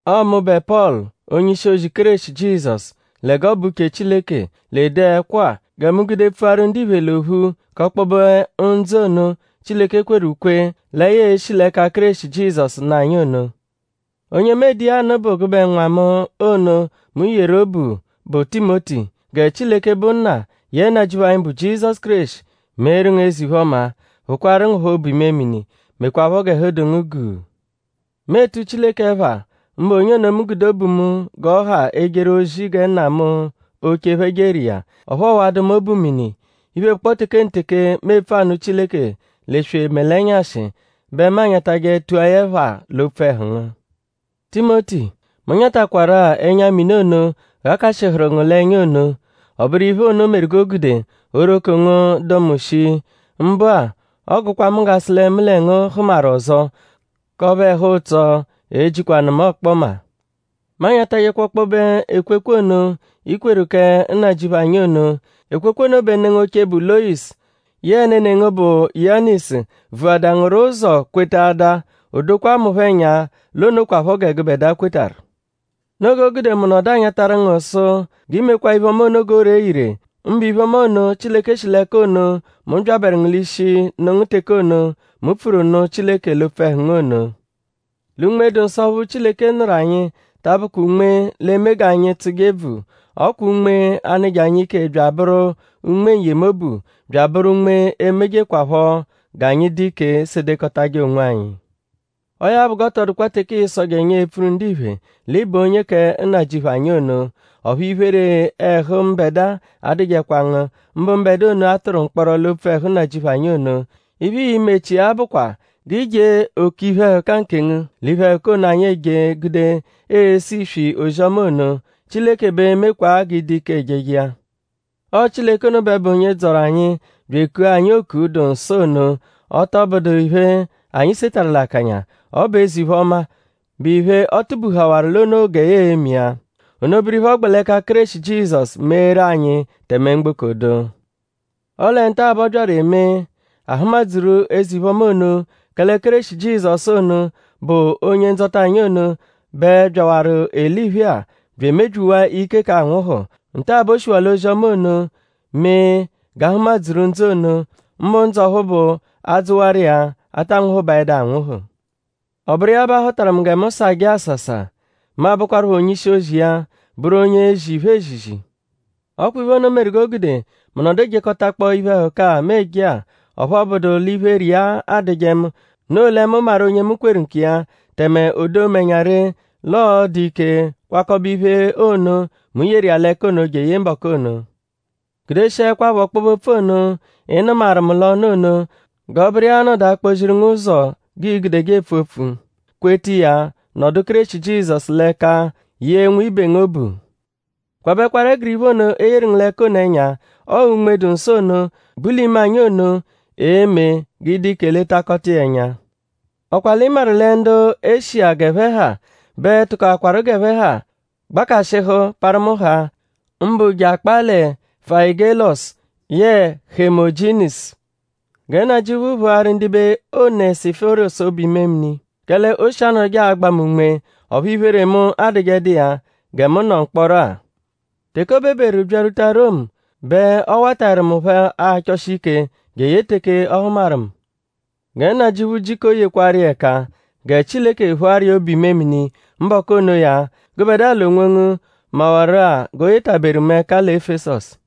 Ọo mụbe Pọlu; onye-ishi-ozi Kéreshi Jizọsu lẹ g'ọ bụ uche Chileke l'ede ẹkwo-a; gẹ mu gude pfuaru ndiphe l'ophu k'ọkpobe ndzụ ono, Chileke kweru ukwe lẹ ya e-shi l'ẹka Kéreshi Jizọsu nụ anyi ono. Onye mu ede iya anụ bụ gụbe nwa mu ono, mu yeru obu, bụ Timoti. Gẹ Chileke, bụ Nna; yẹe Nnajịuphu anyi, bụ Kéreshi Jizọsu meeru ngu eze-iphe-ọma; phụkwaaru ngu phọ obu-imemini; mekwaphọ g'ẹhu dụ ngu guu. Mu etu Chileke ẹpha; mbụ onye mu gude obu mu g'ọ ha ejeru ozi gẹ nna mu oche phẹ jeru iya; ọphu ọowadu mu obu mini. Iphe, bụkpoo tekenteke, mu epfu anụ Chileke l'eswe mẹ l'ẹnyashi bẹ mu anyatajẹ tua ya ẹpha l'opfu ẹhu ngu. Timoti; mu nyatakwarụ-a ẹnya-mini ono, ghakashịhuru ngu l'ẹnya ono. Ọ bụru iphe ono meru g'o gude oghoroko ngu dụ mu shii. Mbụ-a; ọ gụkwa mu g'a sụ lẹ mu lẹ ngu hụmaru ọzo k'ọphu ẹhu-ụtso e-jikwanụ mu ọkpoma. Mu anyatajẹkwa ọkpobe ekwekwe ono, i kweru kẹ Nnajịuphu anyi ono. Ekwekwe ono bẹ ne ngu oche, bụ Loyisu yẹe nene ngu, bụ Yunayisu vuhaadaa ngu rọ ụzo kwetaadaa; o dokwaa mu phọ ẹnya l'o nokwaphọ gẹ gụbedua kwetarụ. Noo g'o gude mu nọdu anyatarụ ngu sụ g'i mekwaa iphe-ọma ono g'o ree ire; mbụ iphe-ọma ono, Chileke shi l'ẹka ono, mu byabẹru ngu l'ishi nụ ngu teke ono, mu pfuru nụ Chileke l'opfu ẹhu ngu ono. Lẹ Unme-dụ-Nsọ ọphu Chileke nụru anyi ta abụkwa Unme, l'e-me anyi g'anyi tsụje ebvu. Ọ kwa Unme a-nụje anyi ike bya abụru Unme n-yemobu; bya abụru Unme emejekwaphọ g'anyi dụ ike sedekọtaje onwanyi. Ọo ya bụ; g'ọ tọ dụkwa teke ịisoje ẹnya epfuru ndiphe l'ị bụ onye kẹ Nnajịuphu anyi ono. Ọphu iphere ẹhu mbẹdua adụjekwa ngu; mbụ mbẹdua ono, a tụru mkpọro l'opfu ẹhu Nnajịuphu anyi ono. Iphe, ii-mechia bụkwa g'i jee òkè iphe-ẹhuka nkengu l'iphe-ẹhuka ono, anyi eje gude ese iswi ozi-ọma ono. Chileke bẹ e-mekwaa g'ị dụ ike ejeje iya. Ọo Chileke ono bẹ bụ onye dzọru anyi; bya ekua anyi oku, dụ nsọ ono; ọ tọ bụdu iphe, anyi setarụ l'akanya; ọ bụ eze-iphe-ọma, bụ iphe, ọ tụbehawaru l'o noo gẹ ya l'eme iya. Ono bụru iphe, ọ gbẹ l'ẹka Kéreshi Jizọsu meeru anyi tẹme mgboko dụ. Ọle nta-a bẹ ọ byaru emee: a hụma-dzuru eze-iphe-ọma ono; kẹle Kéreshi Jizọsu ono, bụ Onye-Ndzọta anyi ono bẹ byawaru eliphe-a bya emebyiwaa ike k'anwụhu. Nta-a bẹ o shiwaa l'ozi-ọma ono mee g'ahụma-dzuru ndzụ ono; mbụ ndzụ ọphu bụ a -dzụwaru iya; a taa nwụhubaedu anwụhu. Ọ bụru iya bẹ a họtaru mu gẹ mu sajẹ àsàsà; mu abụkwarupho onye-ishi-ozi iya; bụru onye ezi iphe ezizi. Ọ kwa iphe ono meru g'o gude mu nọdu ejekọtakpoo iphe-ẹhuka-a, mu eje-a; ọphu ọ bụdu l'iphere iya adụje mu; noo lẹ mu maru onye mu kweru nkiya; tẹme o doo mu ẹnya ree l'ọo-dụ ike kwakọbe iphe ono, mu yeru iya l'ẹka ono jeye mbọku ono. Gudeshiẹkwapho ọkpobe-opfu ono, ị nụmaru mu l'ọnu ono; g'ọ bụru iya a-nọdu akpọ-ziru ngu ụzo g'ii-gudeje epfu opfu; kweta iya; nọdu Kéreshi Jizọsu l'ẹka yee nwibe ngu obu. Kwabẹkwaru ẹguru iphe ono, e yeru ngu l'ẹka ono ẹnya. Ọo Unme-dụ-Nsọ ono, bu l'ime anyi ono e-me g'ị dụ ike letakọta iya ẹnya. ?Ọ kwa l'ị maru lẹ ndu Eshiya, g'ẹphe ha bẹ tụkoakwaru g'ẹphe ha gbakashịhu parụ mu haa; mbụ je akpaa lẹ Fayigẹlosu yẹe Hemojinizu. Gẹ Nnajịuphu phụaru ndibe Onẹsiforosu obu-imemini; kẹle o shi anọduje agba mu unme; ọphu iphere mu adụjedu iya gẹ mu nọ mkpọro-a. Teke o beberu byarwuta Romu bẹ ọ wataẹru mu phọ achọshi ike jeye teke ọ hụmaru mu. Gẹ Nnajịuphu jiko yekwarụ iya ẹka; gẹ Chileke phụaru iya obu-imemini mbọku onoya; gụbedua l'onwongu mawaru-a g'o yetaberu mu ẹka lẹ Efesọsu.